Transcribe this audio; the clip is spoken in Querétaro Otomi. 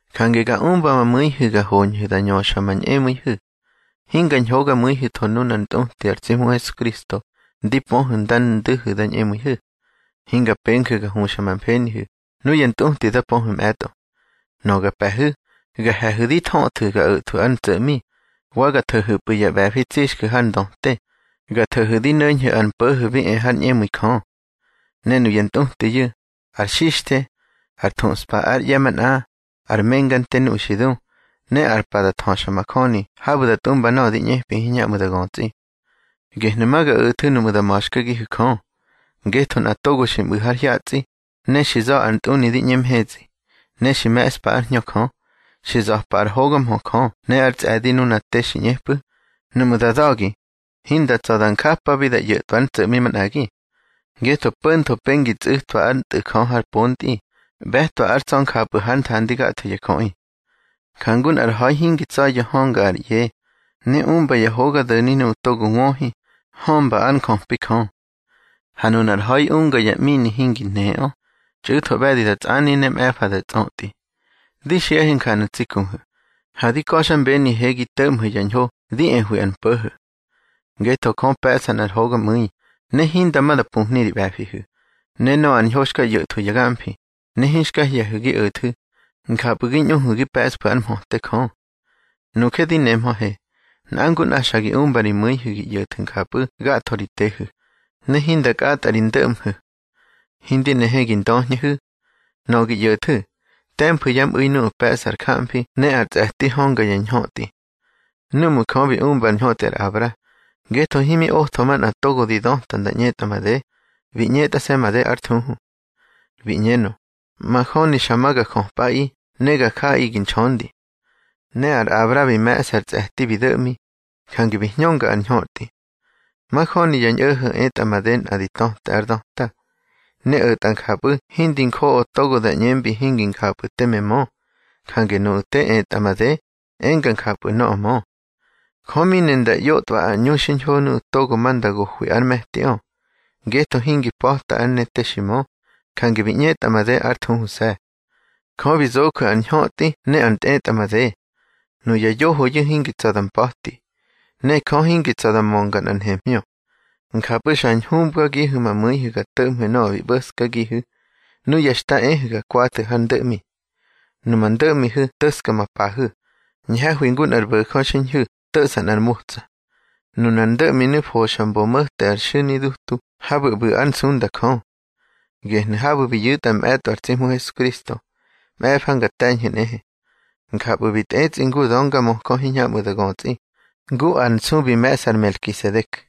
Jange ga umba ma mu̱ihu̱ ga hoñhu̱ da ñöxa ma ñꞌemu̱ihu̱. Hinga ñhogamu̱ihu̱tho nunár ntꞌuti ar tsi Hmu Hesukristo ndi pöhu̱ nda ndu̱hu̱ da ñꞌemu̱ihu̱. Hinga penju̱ ga huxa ma mfenihu̱ nuya ntꞌuti da pöhu̱ mꞌe̱tꞌo. Nöꞌö ga pe̱hu̱, ga he̱hu̱ di thöꞌthu̱ ga o̱thwu̱ ár ntso̱ꞌmi, wa ga tho̱hu̱pꞌu̱ ya ꞌbe̱fi tsixju̱ har ndöte, ga tho̱hu̱ di no̱ñhu̱ ar mpo̱ho̱ bi e har ñꞌemu̱i Jö. Ne nuya ntꞌutiyu̱, ar xixthe, ar thuꞌspa ár ꞌye̱ manꞌa, ár menga nte nuꞌu̱ xi du, ne ar pa da thöxamajöni habu̱ da tꞌumba nöꞌö di ꞌñepi hiñhamꞌu̱ da götsꞌi. Gehnu̱ ma ga o̱thu̱ nuꞌmu̱ da ma̱xkagihu̱ Jö. Ngetho nꞌa togo xi mꞌu̱ har hyatsꞌi, ne xi za̱ ar ntꞌuni di ꞌñe mhetsꞌi, ne xi me̱ꞌspa ár Hñö Jö, xi za̱pa ár hoga mhö Jö ne ár tsꞌe̱di nuna te xi ꞌñepꞌu̱, nuꞌmu̱ da da̱gi, hinda tsa̱ da njapabi da ꞌyo̱tꞌwa ár ntso̱ꞌmi manꞌagi. Ngetho po̱ntho pengi tsu̱tꞌwa ár Tꞌu̱ Jö har pontꞌi, ꞌbe̱twa ár tsa̱ njapꞌu̱ hár nthandi gatho ya jöꞌi. Jangu nꞌar ha̱i hingi tsa̱ya̱ hönga ar ꞌye, ne umba ya hoga do̱ni nuꞌu̱ togo wöhi, hömba ár njöpi Jö. Ha nunar ha̱i unga ya ꞌmini hingi nheꞌö, txꞌu̱tho ꞌbe̱di da tsꞌani, ne mꞌe̱fa da tsꞌötꞌi. Di xiꞌahe njanu̱ tsi kuhu̱, ha di ka̱xmbenihe gi to̱ꞌmhu̱ ya ñho di ehwi ar mpo̱ho̱. Ngetho Jö pe̱ꞌsa nꞌar hogamu̱i, ne hinda ma da pumhni ri ꞌbe̱fihu̱, ne nöꞌö ar ñho xka ꞌyo̱thwu̱ ya gamfi, ne hinxka hye̱hu̱ gi o̱thu̱, njapꞌu̱ gi ñꞌuhu̱ gi pe̱ꞌsfu̱ ár mhöte Jö. Nuje di nemhöhe, nꞌa ngu nꞌa xa gi umba ri mu̱ihu̱ gi ꞌyo̱thu̱ njapꞌu̱ gatho ri tehu̱, ne hinda kꞌatꞌa ri ndo̱ꞌmhu̱. Hindi nehe gi ndöhñehu̱. Nöꞌö gi ꞌyo̱thu̱, te̱mfu̱ yá mꞌu̱i nuꞌu̱ pe̱ꞌsa ar jamfi ne ar tsꞌe̱ti hönga ya ñhötꞌi. Núꞌmu̱ Jö bi umba ar ñhötꞌi ar Abra, ngetho himi otho manꞌa togo di döta nda ꞌñetꞌa made, bi ꞌñetꞌase̱ made ár thuhu. Bi ꞌñenö: Majöni xa ma ga jöpꞌaꞌi ne ga jaꞌi gi nxöndi. Ne ar Abra bi me̱ꞌsa ar tsꞌe̱ti bi do̱ꞌmi, jange bi hñönga ar ñhötꞌi. Majöni ya ñꞌo̱ho̱ etꞌa made nꞌa di töte ar döta, ne o̱tꞌa njapꞌu̱ hindi njoꞌo togo da ꞌñembi hingi njapꞌu̱ teme mö. Jange nuꞌu̱ te etꞌa made, enga njapꞌu̱ nöꞌö mö. Jö mi ne nda ꞌyotꞌwa ár ꞌñu xiñho nuꞌu̱ togo ma nda gohwi ár me̱tiꞌö, ngetho hingi pa̱ta ár ne te xi mö, jange bi ꞌñetꞌa made ár thuhuse̱. Jö bi zoju̱ ár ñhötꞌi ne ár ntꞌetꞌamade. Nuya yohoyu̱ hingi tsa̱ da mpa̱ti, ne Jö hingi tsa̱ da mönga nꞌar nhemhñö. Njapꞌu̱ xa hñubgagihu̱ ma mu̱ihu̱ ga to̱ꞌmhu̱ nöꞌö xi ꞌbo̱skagihu̱ núya xta ehu̱ ga kwathu̱ hár ndo̱ꞌmi. Numa ndo̱ꞌmihu̱ to̱ska ma pahu̱, ñhe̱hwi ngu nꞌar bo̱jö xiñhu̱ to̱ꞌsa nꞌar motsa. Nunar ndo̱ꞌminu̱ foxa mbo mo̱te ar xu̱nidutu habu̱ ꞌbu̱ ár nsunda Jö. Gehnu̱ habu̱ bi yu̱tꞌa mꞌe̱tꞌo ar tsi Hmu Hesukristo, mꞌe̱fa nga te̱ñhu̱ nꞌehe. Njapꞌu̱ bi tꞌetsꞌi ngu ar döngamöjö hiñhamꞌu̱ da götsꞌi, ngu ar nsu bi me̱ꞌsa ar Melkisedek.